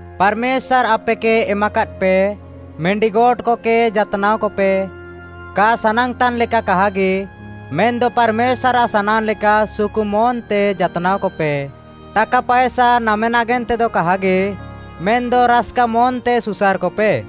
ପାର୍‌ମେଶ୍ୱାର୍‌ ଆପେକେ ଏମାକାଦ୍‌ପେ ମିଣ୍ଡିଗୋଟ୍‌କକେ ଯାତ୍‌ନାଅକପେ, କା ସାନାଙ୍ଗ୍‌ତାନ୍‌ ଲେକା କାହାଗି, ମେନ୍‌ଦ ପାର୍‌ମେଶ୍ୱାର୍‌ଆଃ ସାନାଙ୍ଗ୍‌ଲେକା ସୁକୁ ମନ୍‌ତେ ଯାତ୍‌ନାଅକପେ। ଟାକା ପାଏସା ନାମେ ନାଗେନ୍ତେଦ କାହାଗି, ମେନ୍‌ଦ ରାସ୍‌କା ମନ୍‌ତେ ସୁସାର୍‌କପେ।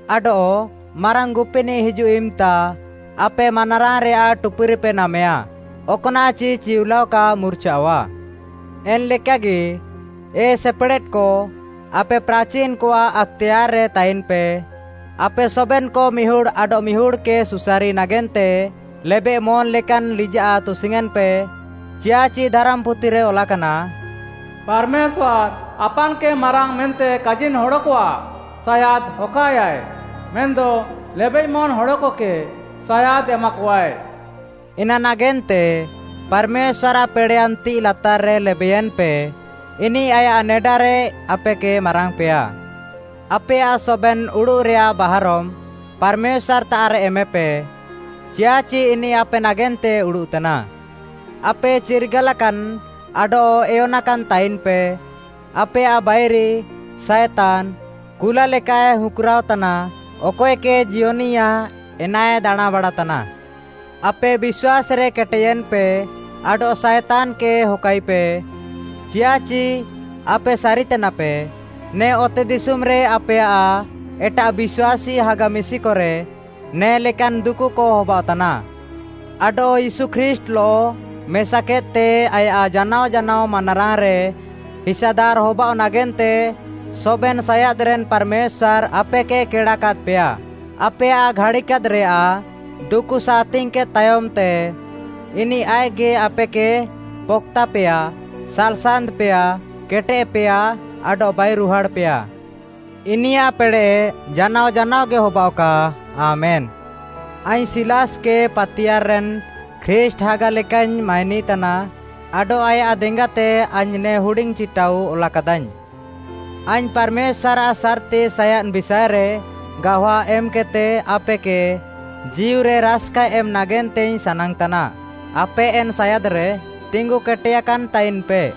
ଆଡଃ ମାରାଙ୍ଗ୍‌ ଗୁପିନିଃ ହିଜୁଃ ଇମ୍‌ତା, ଆପେ ମାନାରାଙ୍ଗ୍‌ରେୟାଃ ଟୁପୁରିପେ ନାମେୟା। ଅକ୍‌ନାଃଚି ଚିଉଲାଅ କା ମୁର୍ଚାଅଃଆ। ଏନ୍‌ଲେକାଗି, ଏ ସେପେଡ଼େଦ୍‌କ, ଆପେ ପ୍ରାଚିନ୍‌କଆଃ ଆକ୍‌ତେୟାର୍‌ରେ ତାଇନ୍‌ପେ। ଆପେ ସବେନ୍‌କ ମିହୁଡ଼୍‌ ଆଡଃମିହୁଡ଼୍‌କେ ସୁସାରି ନାଗେନ୍ତେ ଲେବେଃମନ୍‌ ଲେକାନ୍‌ ଲିଜାଃ ତୁସିୟେଁନ୍‌ପେ। ଚିୟାଃଚି ଧାରାମ୍‌ପୁଥିରେ ଅଲାକାନା, “ପାର୍‌ମେଶ୍ୱାର୍‌ ଆପାନ୍‌କେ ମାରାଙ୍ଗ୍‌ ମେନ୍ତେ କାଜିନ୍‌ ହଡ଼କଆଃ ସାୟାଦ୍‌ ହକାଏୟାଏ, ମେନ୍‌ଦ ଲେବେଃମନ୍‌ ହଡ଼କକେ ସାୟାଦ୍‌ ଏମାକଆଏ।” ଏନାନାଗେନ୍ତେ ପାର୍‌ମେଶ୍ୱାର୍‌ଆଃ ପେଡ଼େୟାନ୍ ତିଃଇ ଲାତାର୍‌ରେ ଲେବେୟେନ୍‌ପେ, ଇନିଃ ଆୟାଃ ନେଡାରେ ଆପେକେ ମାରାଙ୍ଗ୍‌ପେୟା। ଆପେୟାଃ ସବେନ୍‌ ଉଡ଼ୁଃରେୟାଃ ବାହାରମ୍‌ ପାର୍‌ମେଶ୍ୱାର୍‌ତାଃରେ ଏମେପେ, ଚିୟାଃଚି ଇନିଃ ଆପେ ନାଗେନ୍ତେ ଉଡ଼ୁଃତାନା। ଆପେ ଚିର୍ଗାଲାକାନ୍‌ ଆଡଃ ଏୟନାକାନ୍‌ ତାଇନ୍‌ପେ। ଆପେୟାଃ ବାଇରି, ସାଏତାନ୍‌, କୁଲା ଲେକାଏ ହୁଁକ୍‌ରାଅ ତାନା। ଅକଏକେ ଜିୟନିଆ ଏନାଏ ଦାଣାଁଁବାଡ଼ା ତାନା। ଆପେ ବିଶ୍ୱାସ୍‌ରେ କେଟେୟେନ୍‌ପେ ଆଡଃ ସାଏତାନ୍‌କେ ହକାଇପେ, ଚିୟାଃଚି ଆପେ ସାରିତାନାପେ, ନେ ଅତେଦିଶୁମ୍‌ରେ ଆପେୟାଃ ଏଟାଃ ବିଶ୍ୱାସୀ ହାଗା ମିଶିକରେ ନେ ଲେକାନ୍‌ ଦୁକୁକ ହବାଅଃତାନା। ଆଡଃ ୟୀଶୁ ଖ୍ରୀଷ୍ଟ୍‌ଲଃ ମେସାକେଦ୍‌ତେ ଆୟାଃ ଜାନାଅ ଜାନାଅ ମାନାରାଙ୍ଗ୍‌ରେ ହିସାଦାର୍‌ ହବାଅଃ ନାଗେନ୍ତେ ସବେନ୍‌ ସାୟାଦ୍‌ରେନ୍‌ ପାର୍‌ମେଶ୍ୱାର୍‌ ଆପେକେ କେଡ଼ାକାଦ୍‌ପେୟା। ଆପେୟାଃ ଘାଡ଼ିକାଦ୍‌ରେୟାଃ ଦୁକୁ ସାହାତିଙ୍ଗ୍‌କେଦ୍‌ ତାୟମ୍‌ତେ, ଇନିଃ ଆଇଃକ୍‌ଗି ଆପେକେ ପକ୍‌ତାପେୟା, ସାଲ୍‌ସାନ୍ତ୍‌ପେୟା, କେଟେଦ୍‌ପେୟା, ଆଡଃ ବାଇରୁହାଡ଼୍‌ପେୟା। ଇନିୟାଃ ପେଡ଼େଃ ଜାନାଅ ଜାନାଅଗି ହବାଅଃକା। ଆମେନ୍‌। ଆଇଙ୍ଗ୍‌ ସିଲାସ୍‌କେ ପାତିୟାର୍‌ରେନ୍‌ ଖ୍ରୀଷ୍ଟ୍‌ ହାଗା ଲେକାଇଙ୍ଗ୍‌ ମାଇନିତାନା ଆଡଃ ଆୟାଃ ଦେଙ୍ଗାତେ ଆଇଙ୍ଗ୍‌ ନେ ହୁଡିଙ୍ଗ୍‌ ଚିଟାଉ ଅଲାକାଦାଇଙ୍ଗ୍‌। ଆଇଙ୍ଗ୍‌ ପାର୍‌ମେଶ୍ୱାର୍‌ଆଃ ସାର୍‌ତି ସାୟାଦ୍‌ ବିଷାଏରେ ଗାୱା ଏମ୍‌କେଦ୍‌ତେ ଆପେକେ ଜୀଉରେ ରାସ୍‌କା ଏମ୍‌ ନାଗେନ୍ତେଇଙ୍ଗ୍‌ ସାନାଙ୍ଗ୍‌ତାନା। ଆପେ ଏନ୍‌ ସାୟାଦ୍‌ରେ ତିଙ୍ଗୁକେଟେୟାକାନ୍‌ ତାଇନ୍‌ପେ।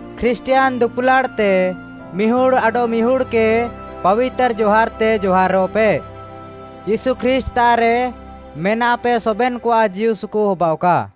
ଖ୍ରୀଷ୍ଟିୟାନ୍‌ ଦୁଲାଡ଼୍‌ତେ ମିହୁଡ଼୍‌ ଆଡଃମିହୁଡ଼୍‌କେ ପାବିତାର୍‌ ଜହାର୍‌ତେ ଜହାରଃପେ। ୟୀଶୁ ଖ୍ରୀଷ୍ଟ୍‌ତାଃରେ ମେନାପେ ସବେନ୍‌କଆଃ ଜୀଉସୁକୁ ହବାଅଃକା।